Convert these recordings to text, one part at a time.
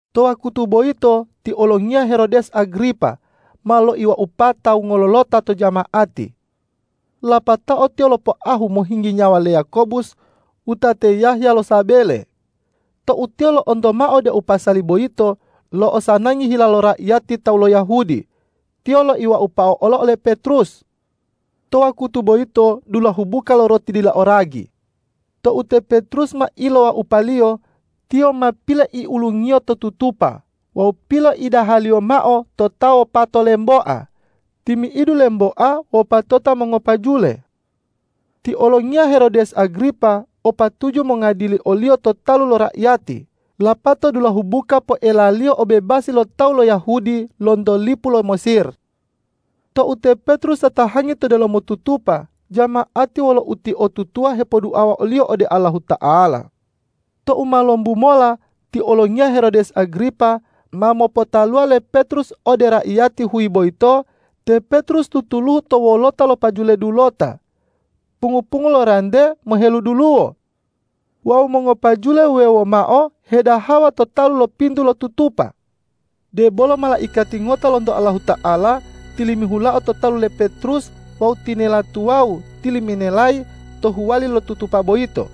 To wakutu boyito ti olongiya Herodes Agripa ma loiwaupa tawu ngololota to jama'ati. Lapatao tiyo lopoahu mohinggi nyawa le Yakobus wutate Yahya lo sabele. Tou tiyo lo'onto mao deu pasali boyito lo'osanangi hila lo raiyati tawu lo Yahudi, tiyo loiwaupao olo ole Petrus. To wa kutu boyito dulahu buka lo roti dila o ragi. Tou te Petrus ma ilowaupaliyo, tiyo ma piloiulungiyo to tutupa wawu piloida haliyo mao to ta wopato lemboa, timi'idu lemboa wopatota mongopajule. Ti olongiya Herodes Agripa o patuju mongadili oliyo to talu lo raiyati lapato dulahu buka poelaliyo obebasi lo tawu lo Yahudi lonto lipu lo Mesir. Tou te Petrus tatahangi to delomo tutupa, jama'ati wolo utiotutuwa hepoduawa oliyo ode Allahuta'ala. Tou ma lombu mola ti olongiya Herodes Agripa ma mopotaluwa le Petrus ode raiyati huyi boyito, te Petrus tutuluhu to wolota lo pajule dulota, pungu-pungu lo rante meheluduluwo. Wawu mongopajule wuwewo mao hedahawa to talu lo pintu lo tutupa. Debolo malaikati ngota lonto Allahuta'ala tilimihulao to talu le Petrus wawu tinela tuwawu tiliminelayi to huwali lo tutupa boyito.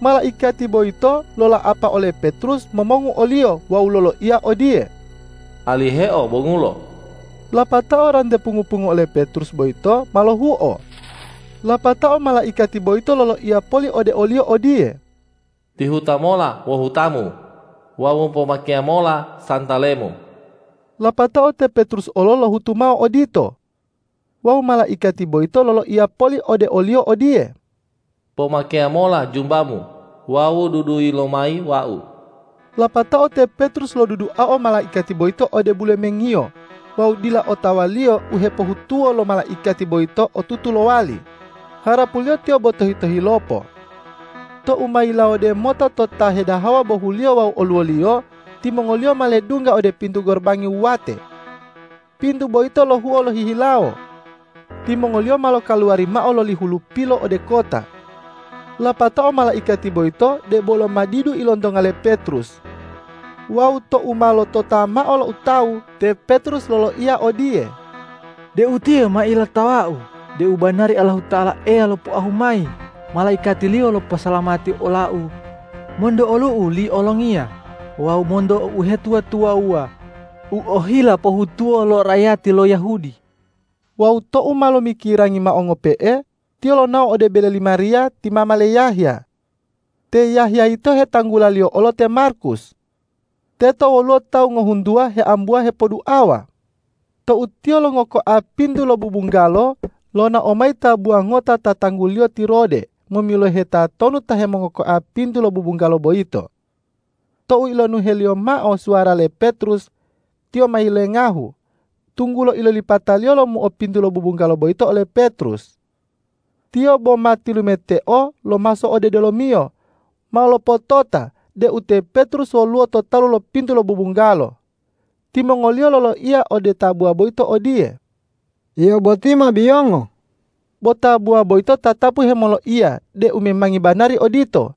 Malaikati boyito lola'apa ole Petrus momongu oliyo wawu loloiya odiye,”Aliheo bongulo!” Lapatao rante pungu-pungu ole Petrus boyito ma lohuo. Lapatao malaikati boyito loloiya poli ode oliyo odiye,”Tihuta mola wohutamu wawu pomakeya mola santalemu!” Lapatao te Petrus olo lohutu mao odito. Wawu malaikati boyito loloiya poli ode oliyo odiye,”Pomakeya mola jumbamu wawu dudui lomayi wau!” Lapatao te Petrus loduduao malaikati boyito ode bulemengiyo wawu dila otawaliyo u hepohutuwo lo malaikati boyito otutu lowali, harapuliyo tiyo bo tohi-tohilopo. Tou ma yilumawode mota to ta hedahawa bohuliyo wawu oluwoliyo, timongoliyo ma ledungga ode pintu gorobangi wuwate. Pintu boyito lohuo lohihilawo. Timongoliyo ma lokaluwari mao loli hulupilo ode kota. Lapatao malaikati boyito debolo ma didu ilontonga le Petrus. Wawu tou ma lotota mao loutawu, te Petrus loloiya odiye,”De utiye ma ilotawau deu banari Allahuta'ala Eya lopoahu mayi malaikati-Liyo loposalamati olau monto olu'u li olongiya wawu monto uhetuwa-tuwawuwa u ohila pohutuwo lo raiyati lo Yahudi.” Wawu tou ma lomikirangi mao ngope'e, tiyo lonao ode bele li Mariya ti mama le Yahya. Te Yahya yito hetanggulaliyo olo te Markus. Teto woluwo tawu ngohuntuwa heambuwa hepoduawa. Tou tiyo longokoao pintu lo bubunggalo, lonao mayi tabuwa ngota ta tangguliyo ti Rode momilohe tatonu ta hemongokoa pintu lo bubunggalo boyito. Tou ilonuheliyo mao suwara le Petrus, tiyo ma yilengahu, tunggulo ilolipataliyo lomuo pintu lo bubunggalo boyito ole Petrus. Tiyo boma tilumeteo lomaso ode delomiyo mao lopotota deu te Petrus woluwo to talu lo pintu lo bubunggalo. Timongoliyo loloiya ode tabuwa boyito odiye,”Yio boti ma biyongo.” Bo tabuwa boyito tatapu hemoloiya deu memangi banari odito.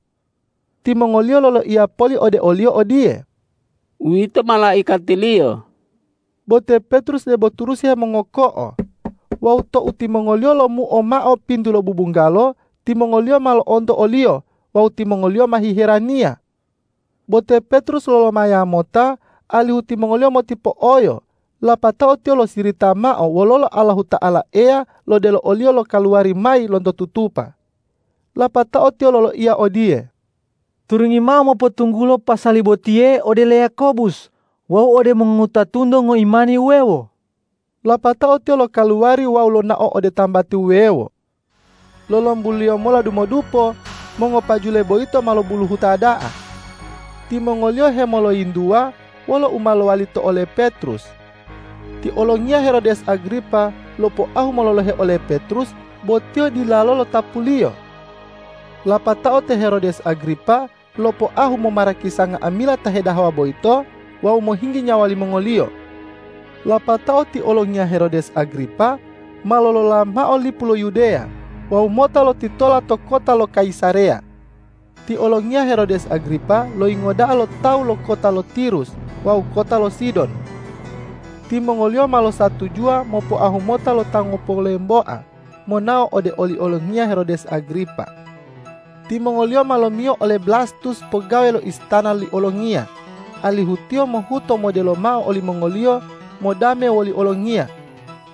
Timongoliyo loloiya poli ode oliyo odiye,”Uwito malaikatiliyo.” Bo te Petrus debo turusi hemongoko'o, wawu tou timongoliyo lomuo mao pintu lo bubunggalo, timongoliyo ma lo'onto oliyo wawu timongoliyo ma hiheraniya. Bo te Petrus lolomaya mota, alihu timongoliyo motipo'oyo, lapatao tiyo losirita mao wololo Allahuta'ala Eya lodelo oliyo lokaluwari mayi lonto tutupa. Lapatao tiyo loloiya odiye,”Turungi mao mopotunggulo pasali botiye ode le Yakobus wawu ode mongowutatunto ngoimani wuwewo.” Lapatao tiyo lokaluwari wawu lonao ode tambati wuwewo. Lolombuliyo mola dumodupo mongopajule boyito ma lobuluhuta da'a. Timongoliyo hemoloyintuwa wolo u ma lowali to ole Petrus. Ti olongiya Herodes Agripa lopoahu mololohe ole Petrus, bo tiyo dilalo lotapuliyo. Lapatao te Herodes Agripa lopoahu momarakisa nga'amila ta hedahawa boyito wawu mohinggi nyawa limongoliyo. Lapatao ti olongiya Herodes Agripa ma lolola mao lipu lo Yudeya wawu mota lotitola to kota lo Kayisareya. Ti olongiya Herodes Agripa loyingo da'a lo tawu lo kota lo Tirus wawu kota lo Sidon. Timongoliyo ma losatujuwa mopoahu mota lo ta ngopolemboa monao ode oli olongiya Herodes Agripa. Timongoliyo ma lomiyo ole Blastus pogawe lo istana li olongiya, alihu tiyo mohuto modelo mao olimongoliyo modame woli olongiya,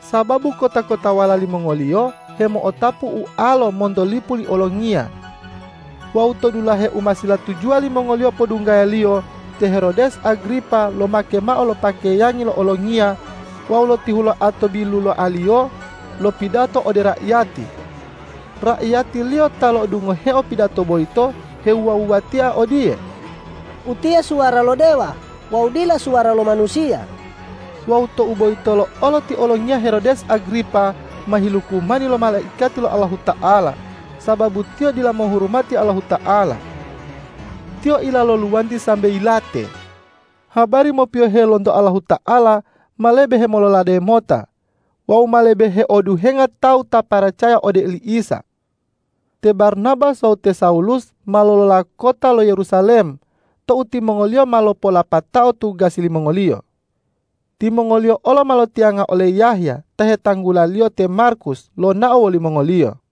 sababu kota-kotawala limongoliyo hemo'otapu ualo monto lipu li olongiya. Wawu to dulahe u ma silatujuwa limongoliyo podunggayaliyo, te Herodes Agripa lomake mao lo pakeyangi lo olongiya wawu lotihuloa to biluloaliyo lopidato ode raiyati. Raiyatiliyo ta lo'odungoheo pidato boyito hewuwa-wuwatia odiye,”Utiye suwara lo dewa wawu dila suwara lo manusiya!” Wawu tou boyitolo olo ti olongiya Herodes Agripa ma hilukumani lo malaikati lo Allahuta'ala, sababu tiyo dila mohurumati Allahuta'ala. Tiyo ila lo luwanti sambe yilate. Habari mopiyohe lonto Allahuta'ala ma lebe hemololade mota wawu ma lebe heoduhenga tawu ta paracaya ode oli Isa. Te Barnabas wawu te Sawulus ma lolola kota lo Yerusalem tou timongoliyo ma lopo'olapatao tugasi limongoliyo. Timongoliyo olo ma lotiyanga ole Yahya ta hetanggulaliyo te Markus lonao wolimongoliyo.